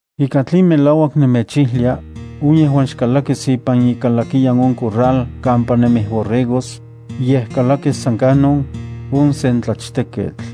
’Ika tlen melauak nemechijlia, on yejuan xkalakis ipan ikalakiyan on corral kampa nemij borregos, yej kalakis san kanon, on sen tlachteketl.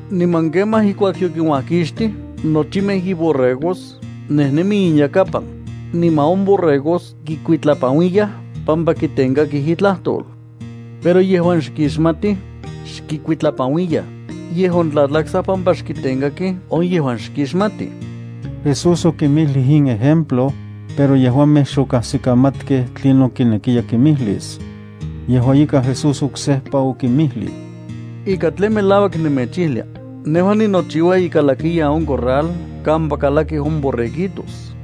Niman kemaj ijkuak yokinuajkixtij nochimej iborregos, nejnemi inyakapan, niman on borregos kikuitlapanuiyaj pampa kitenkakij itlajtol. Pero yejuan xkixmatij, xkikuitlapanuiyaj, yej ontlatlaksaj pampa xkitenkakij on yejuan xkixmatij. Jesús okinmijlij in ejemplo, pero yejuamej xokajsikamatkej tlinon kinekiya kimijlis. Yejua ika, Jesús oksejpa okinmijlij: —Ika tlen melauak nemechijlia: Nejua ninochiua ikalakiyan on corral kampa kalakij on borreguitos.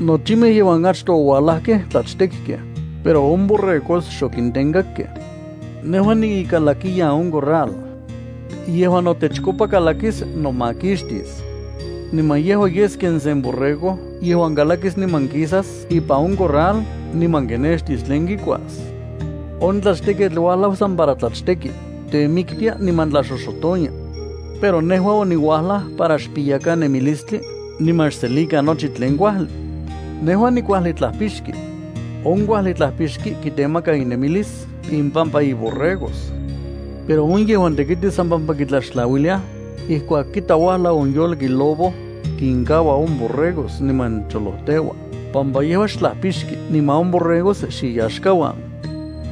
Nochimej yejuan achtoj oualajkej tlachtekkej, pero on borregos xokintenkakkej. Nejua niikalakiyan on corral. Yejuan notechkopa kalakis, nomakixtis. Niman yejua yes ken sen borrego yejuan kalakis niman kisas ipan on corral niman kinextis tlen kikuas. On tlachteketl uajlau san para tlachteki, temiktia niman tlaxoxotonia. Pero nejua oniuajlaj para xpiyakan nemilistli, niman xselikan nochi tlen kuajli. ’Nejua nikuajli tlajpixki. On kuajli tlapixki kitemaka inemilis impampa on borregos. Pero on yejuan tekiti san pampa kitlaxtlauiliaj, ijkuak kita uajlau on yolki lobo, kinkaua on borregos niman cholojteua, pampa yejua xtlajpixki niman on borregos xiyaxkauan.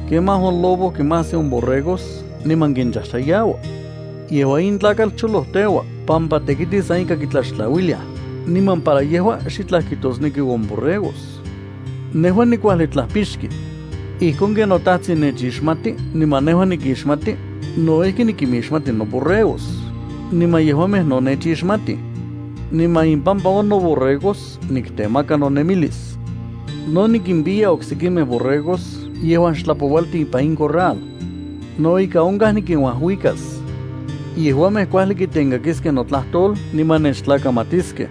Kemaj on lobo kinmajsi on borregos niman kinchajchayaua. Yejua in tlakatl cholojteua pampa tekiti san ika kitlaxtlauiliaj, niman para yejua xitlaj kijtosneki on borregos. Nejua nikuajli tlajpixki. Ijkon ken noTajtsin nechixmati niman nejua nikixmati, no ijki nikinmixmati noborregos, niman yejuamej no nechixmatij. Niman impampa on noborregos niktemaka nonemilis. No nikimpiya oksekimej borregos yejuan xtlapoualti ipan in corral. No ika onkaj nikinuajuikas. Yejuamej kuajli kitenkakiskej notlajtol niman nechtlakamatiskej.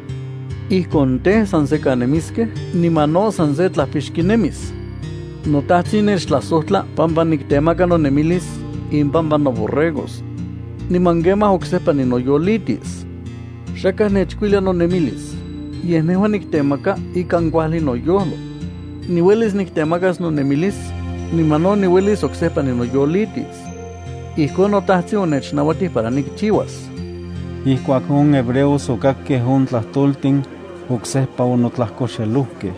Ijkon tej, san sekan nemiskej niman no san se tlapixki nemis. ’NoTajtsin nechtlajsojtla pampa niktemaka nonemilis impampa noborregos. Niman kemaj oksejpa ninoyolitis. Xakaj nechkuilia nonemilis, yej nejua niktemaka ikan kuajli noyojlo. Niuelis niktemakas nonemilis, niman no niuelis oksejpa ninoyolitis. Ijkon noTajtsin onechnauatij para nikchiuas. Ijkuak on hebreos okakkej on tlajtoltin, oksejpa onotlajkoxejlokej.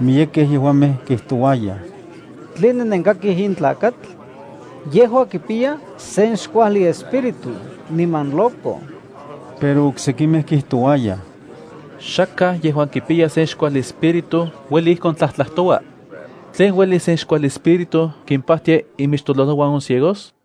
Miyekej yejuamej kijtouayaj: —¿Tline nenkikakij in tlakatl? Yejua kipiya sen xkuajli espíritu niman loco. Pero oksekimej kijtouayaj: —Xakaj yejuan kipiya sen xkuajli espíritu ueli ijkon tlatlajtoua. ¿Tlen ueli sen xkuajli espíritu kimpajtia imixtololojuan on ciegos?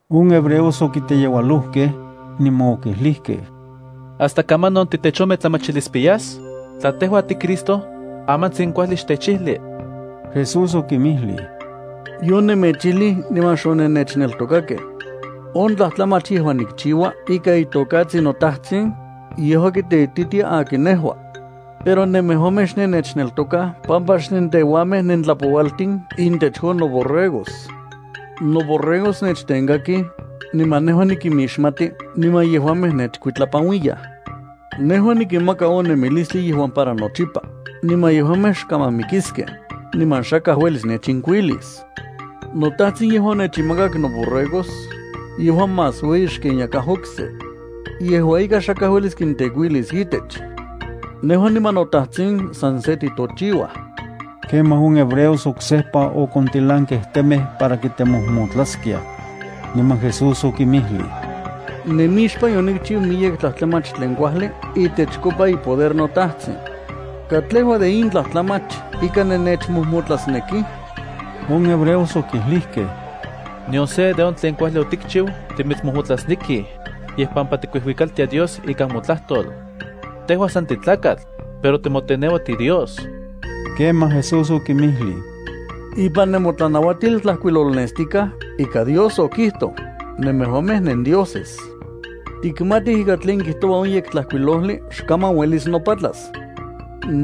On hebreos okiteyeualojkej, niman okijlijkej: —¿Hasta kamanon titechometlamachilispiyas? Tla tejua tiCristo, amantsin kuajli xtechijli. Jesús okinmijlij: —Yonemechijlij niman xonennechneltokajkej. On tlajtlamach yejuan nikchiua ikan itokatsin noTajtsin, yejua kiteititia akin nejua. Pero nemejuamej xnennechneltokaj pampa xnenteuanmej nentlapoualtin intech on noborregos. Noborregos nechtenkakij, niman nejua nikimixmati niman yejuamej nechkuitlapanuiyaj. Nejua nikinmaka on nemilistli yejuan para nochipa, niman yejuamej xkaman mikiskej, niman xakaj uelis nechinkuilis. NoTajtsin yejuan onechinmakak noborregos, yejua más ueyi xken yakaj okse. Yejua ika, xakaj uelis kintekuilis itech. Nejua niman noTajtsin san se titochiuaj. Kemaj on hebreos oksejpa okontilankej temej para kimojmotlaskiaj. Niman Jesús okinmijlij: —Nemixpan yonikchiu miyek tlajtlamach tlen kuajli itechkopa ipoder noTajtsin. ¿Katlejua de in tlajtlamach ika nennechmojmotlasnekij? On hebreos okijlijkej: —Nion se de on tlen kuajli otikchiu timitsmojmotlasnekij, yej pampa tikuijuikaltia Dios ikan motlajtol. Tejua san titlakatl, pero timoteneua tiDios. Kemaj Jesús okinmijlij: —Ipan nemotlanauatil tlajkuilolnestikaj ika Dios okijtoj: “Nemejuamej nendioses.” Tikmatij ika tlen kijtoua on Yektlajkuilojli xkaman uelis nopatlas.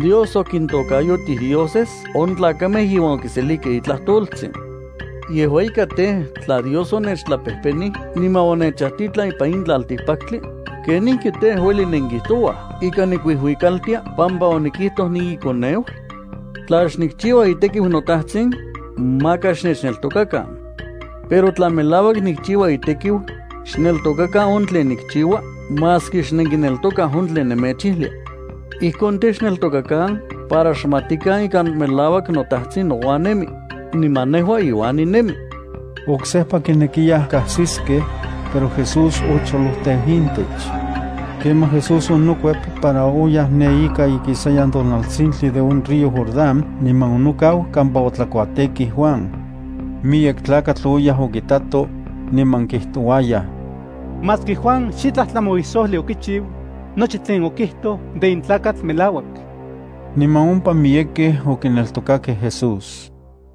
Dios okintokayotij dioses on tlakamej yejuan okiselijkej itlajtoltsin. Yejua ika tej, tla Dios onechtlapejpenij niman onechajtitlan ipan in tlaltikpaktli, ¿kenijki tej, ueli nenkijtouaj ika nikuijuikaltia pampa onikijtoj niiKoneu? Tla xnikchiua itekiu noTajtsin, maka xnechneltokakan. Pero tla melauak nikchiua itekiu, xneltokakan on tlen nikchiua maski xnenkinneltokaj on tlen nemechijlia. Ijkon tej, xneltokakan para xmatikan ika melauak noTajtsin nouan nemi, niman nejua iuan ninemi. Oksejpa kinekiyaj kajsiskej, pero Jesús ocholojteu intech. Kemaj Jesús onokuep para oyaj ne ika ikisayan tonaltsintli de on río Jordán niman onokau kampa otlakuatekij Juan. Miyek tlakatl oyaj okitatoj, niman kijtouayaj: —Maski Juan xitlaj tlamauisojli okichiu, nochi tlen okijtoj de in tlakatl melauak. Niman ompa miyekej okineltokakej Jesús.